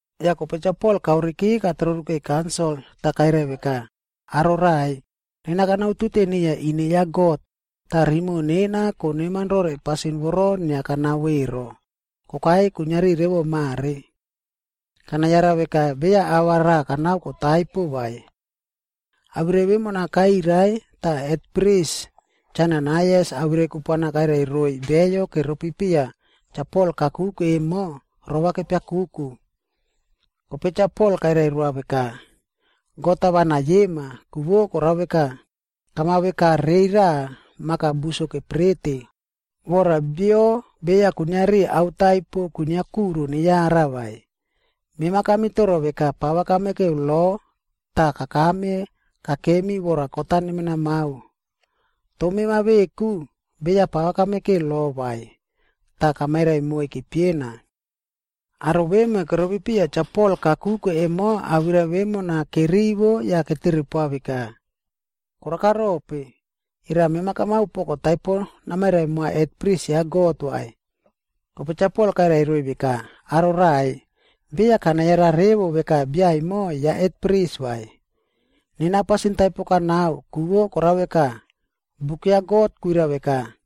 Yah kope Cha Pol kaoreki katrorukei kaunsil, tah kairai veka, “Aro raꞌai, nena kanautute niya ine ya God, tah rimoꞌo nena koneman rore pasin voro inia kanao ero, kokai kuiniari revo mare. Kanayara veka beya ava raꞌa kanao kotaipo vai.” Awirai vemona kairai tah hetpris Cha Ananaias awirai kupuana kairai roiy beyo keropi piya Cha Pol kakuke emo rova nepiakuku. Kope Cha Pol kairai roa veka, “God-a va neyiema, ku vo korao veka, kamaveka rei raꞌa maka buso keprete, vora bio beya kuiniari ao taipo kwinia kuro neyara vai. Mema kamitoro veka pava kamekeu lo tah kakame kakemi vora kot-a nemenamao. Toh mema veku, beya pava kamekeu lo vai, tah kamairai moiy kepiena.” Aro vemo keropi piya Cha Pol kakuke emo awirai vemona kerivo yah ketere poa veka, “Koraka rope, era mema kamao poko taipo namairai moa hetpris ya God vai?” Kope Cha Pol kairai veka, “Aro raꞌai, beya kanayara revo veka bia emo ya hetpris vai. Nena pasin taipo kanao, ku vo korao veka, buk ya God kwirai veka,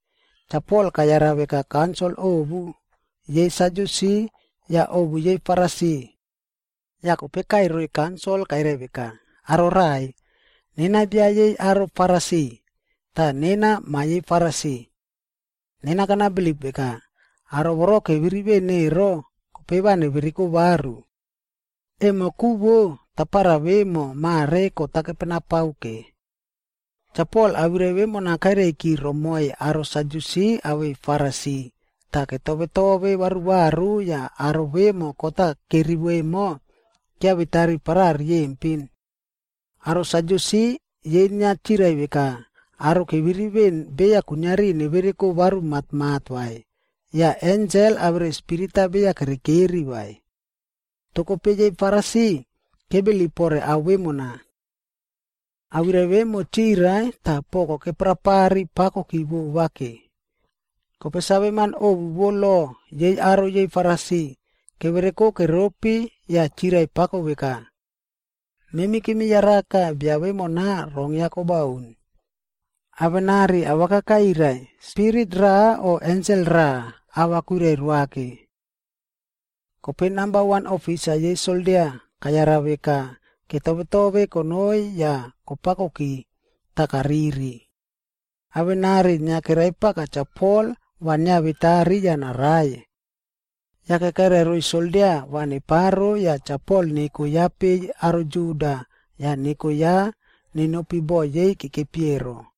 Cha Pol kayara veka kaunsil ovu, yei Sadyusi yah ovu yei Farisi. Yah kope kaꞌai roiy kaunsil kairai veka, “Aro raꞌai, nena bia yei aro Farisi, tah nena ma yei Farisi. Nena kanabilip veka, aro voro keviri veꞌen ero, kope va nevereko varu. Emo ku vo, tapara vemo mare kot-a kepenapao ke.” Cha Pol awirai vemona kairaiki romoiy aro Sadyusi awei Farisi, tah ketove tove varuvaru yah aro vemo kot-a kerivo emo, kiavetari paraꞌa riyempin. Aro Sadyusi, yei inia chirai veka aro keviri veꞌen beya kuiniari nevereko varu matmat vai, yah ensel awere spirit-a beya kerekeri vai. Toh kope yei Farisi, kebilip pore ao vemona. Awirai vemo chirai tah poko keprapari pakoki vova ke. Kope saveman ovu vo lo, yei aro yei Farisi, kevereko keropi yah chirai pako veka, “Memi kemi yaraka bia vemona rong ya kobaun. Avenari awaka kairai, spirit raꞌa o ensel raꞌa, ava kwirai roa ke.” Kope namba wan ofisa yei soldia kayara veka ketovetove konoi yah kopakoki, tah kariri. Avenari inia keraipaka Cha Pol va nawetari yah narai. Yake kairai roiy soldia va neparo yah Cha Pol neko ya peiy aro Juda, yah neko ya nenopi boꞌo yei kekepi ero.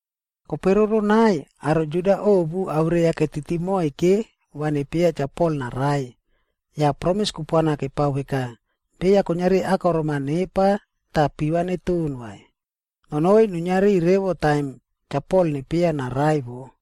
Kope roronai, aro Juda ovu awirai-a ketiti moike va nepieya Cha Pol narai. Yah promis kupuana kepao veka, beya kuiniari akorom-a nepa tah piva neton vai, nonoi nuiniari revo taim Cha Pol nepieya narai wo.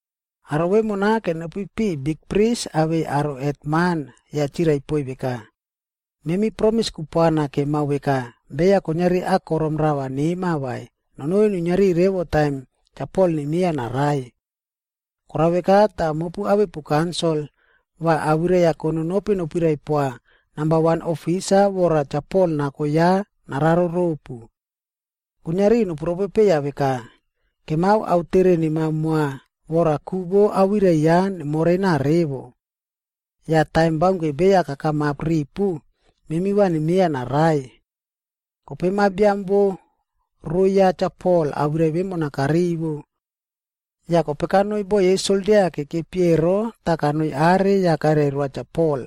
Aro vemona kenopi piꞌiy bikpris awei aro hetman yah chirai poiy veka, “Memi promis kupuana kemao veka, beya kuiniari akorom rava nema vai, nonoi nuiniari revo taim Cha Pol nemieya narai. Korao veka tah mopu awepu kaunsil, va awirai-a kononopi nopirai poa namba wan ofisa vora Cha Pol nako ya nararo ropu. Kuiniari nopu ropopeiya veka, ‘Kemao aotere nemao moa vora ku vo awirai ya nemorena revo. Yah taim baunke beya kakamap ripu, memi va nemieya narai.’” Kope ma biam vo rou ya Cha Pol awirai vemona karivo. Yah kope kanoi boꞌo yei soldia kekepi ero tah kanoi are yah kairai roa Cha Pol.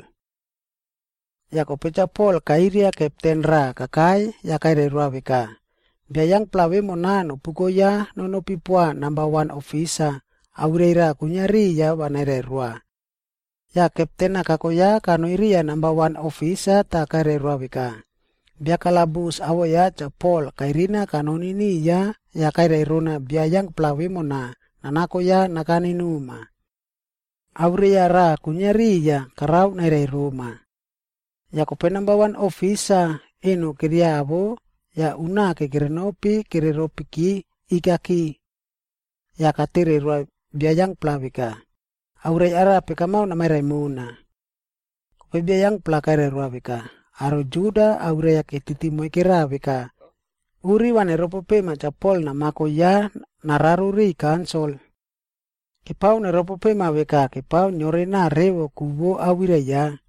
Yah kope Cha Pol kairia kepten raꞌa kakai yah kairai roa veka, “Bia yangpla vemona nopuko ya nonopi poa namba wan ofisa, awirai raꞌa kwinia riya va nairai roa.” Yah kepten-a kako ya kanoi riya namba wan ofisa tah kairai roa veka, “Bia kalabus awoꞌo ya Cha Pol kairina kanoni niya yah kairai rona bia yangpla vemona nanako ya nakane noma. Awirai-a raꞌa kwinia riya karao nairai roma.” Yah kope namba wan ofisa eno keriawo yah unake kerenopi kereropiki ikaki. Yah katere roa bia yangpla veka, “Awirai arape kamao namairai mona?” Kope bia yangpla kairai veka, “Aro Juda, awirai-a ketiti moikera veka uri va neterepoma Cha Pol namako ya nararo riꞌiy kaunsil. Kepao neropopema veka kepao niorenao revo ku vo awirai ya.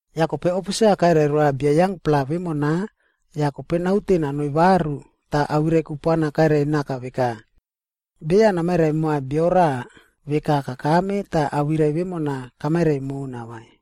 Yah kope ofisa kairai roa bia yangpla vemona yah kope naute nanoi varu tah awirai kupuana kairai naka veka, “Beya namairai moa bio raꞌa veka kakame tah awirai vemona kamairai mona vai.”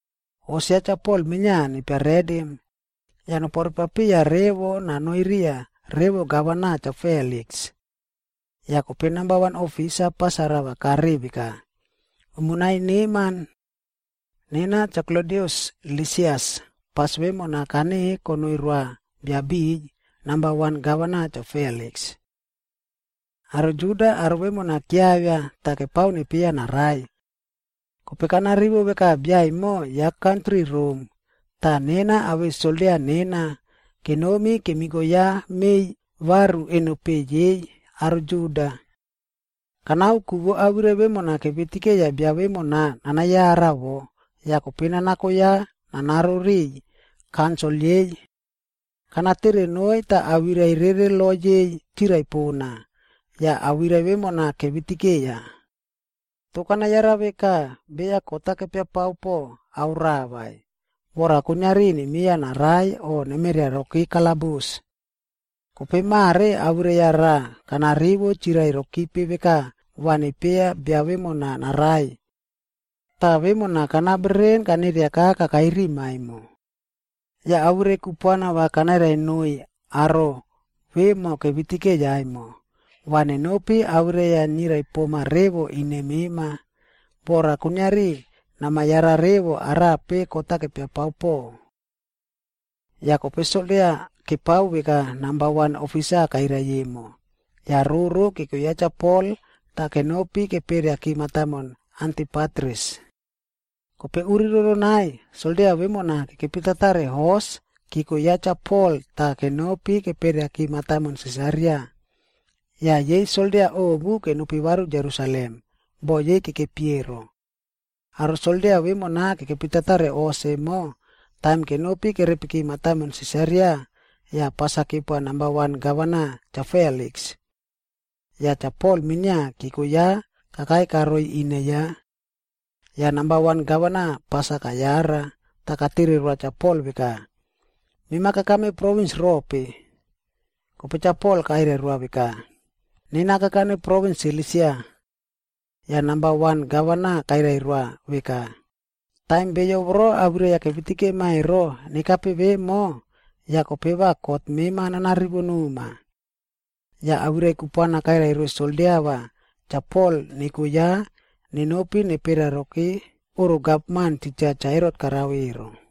Hos ya Cha Pol minia nepia redim, yah noporepapiya revo nanoi riya revo gavana Cha Feliks.” Yah kope namba wan ofisa pas-a rava kareꞌe veka, “Umo nai neman. Nena Cha Klodius Lisias, pas vemona kaneꞌe konoi roa bia biꞌiy, namba wan gavana Cha Feliks. Aro Juda bia vemona kiavia tah kepao nepieya narai. Kope kanarivo veka bia emo ya kantri Rom, tah nena awei soldia nena kenomi kemiko ya meiy varu eno peꞌe yei aro Juda. Kanao ku vo awirai vemona kevitikeiya bia vemona nanayara wo, yah kope nanako ya nararo riꞌiy kaunsil yei. Kanatere noiy tah awirai rere lo yei chirai pona, yah awirai vemona kevitikeiya. Toh kanayara veka beya kot-a kepia pao po ao raꞌa vai, vora kuiniari nemieya narai o nemeriaroki kalabus. Kope mare awirai-a raꞌa kanarivo chirai rokipe veka va nepieya bia vemona narai. Tah vemona kana bereren kaneriaka kakai rima emo. Yah awirai kupuana va kanairai noiy aro vemo kevitikeiya emo, va nenopi awirai-a nirai poma revo ine mema, vora kuiniari namayara revo arape kot-a kepia pao po.” Yah kope soldia kepao veka namba wan ofisa kairai emo, yah roro keko ya Cha Pol tah kenopi keperiaki mataimon Antipatris. Kope uri roronai, soldia vemona kekepitatare hos keko ya Cha Pol tah kenopi keperiaki mataimon Sisaria. Yah yei soldia ovu kenopi varu Jerusalem boꞌo yei kekepi ero. Aro soldia vemona kekepitatare hos emo, taim kenopi kerepiki mataimon Sisaria, yah pas-a kepoa namba wan gavana, Cha Feliks. Yah Cha Pol minia keko ya kakai karoi ine ya. Yah namba wan gavana pas-a kayara, tah katere roa Cha Pol veka, “Mema kakame provins rope?” Kope Cha Pol kairai roa veka, “Nena kakane provins Silisia.” Yah namba wan gavana kairai roa veka, “Taim beyo voro awirai-a kevitikema ero, nekape vemo, yah kope va kot mema nanarivo noma.” Yah awirai kupuana kairai roiy soldia va Cha Pol neko ya nenopi neperiaroki oꞌro gavman titja Cha Herot karao ero.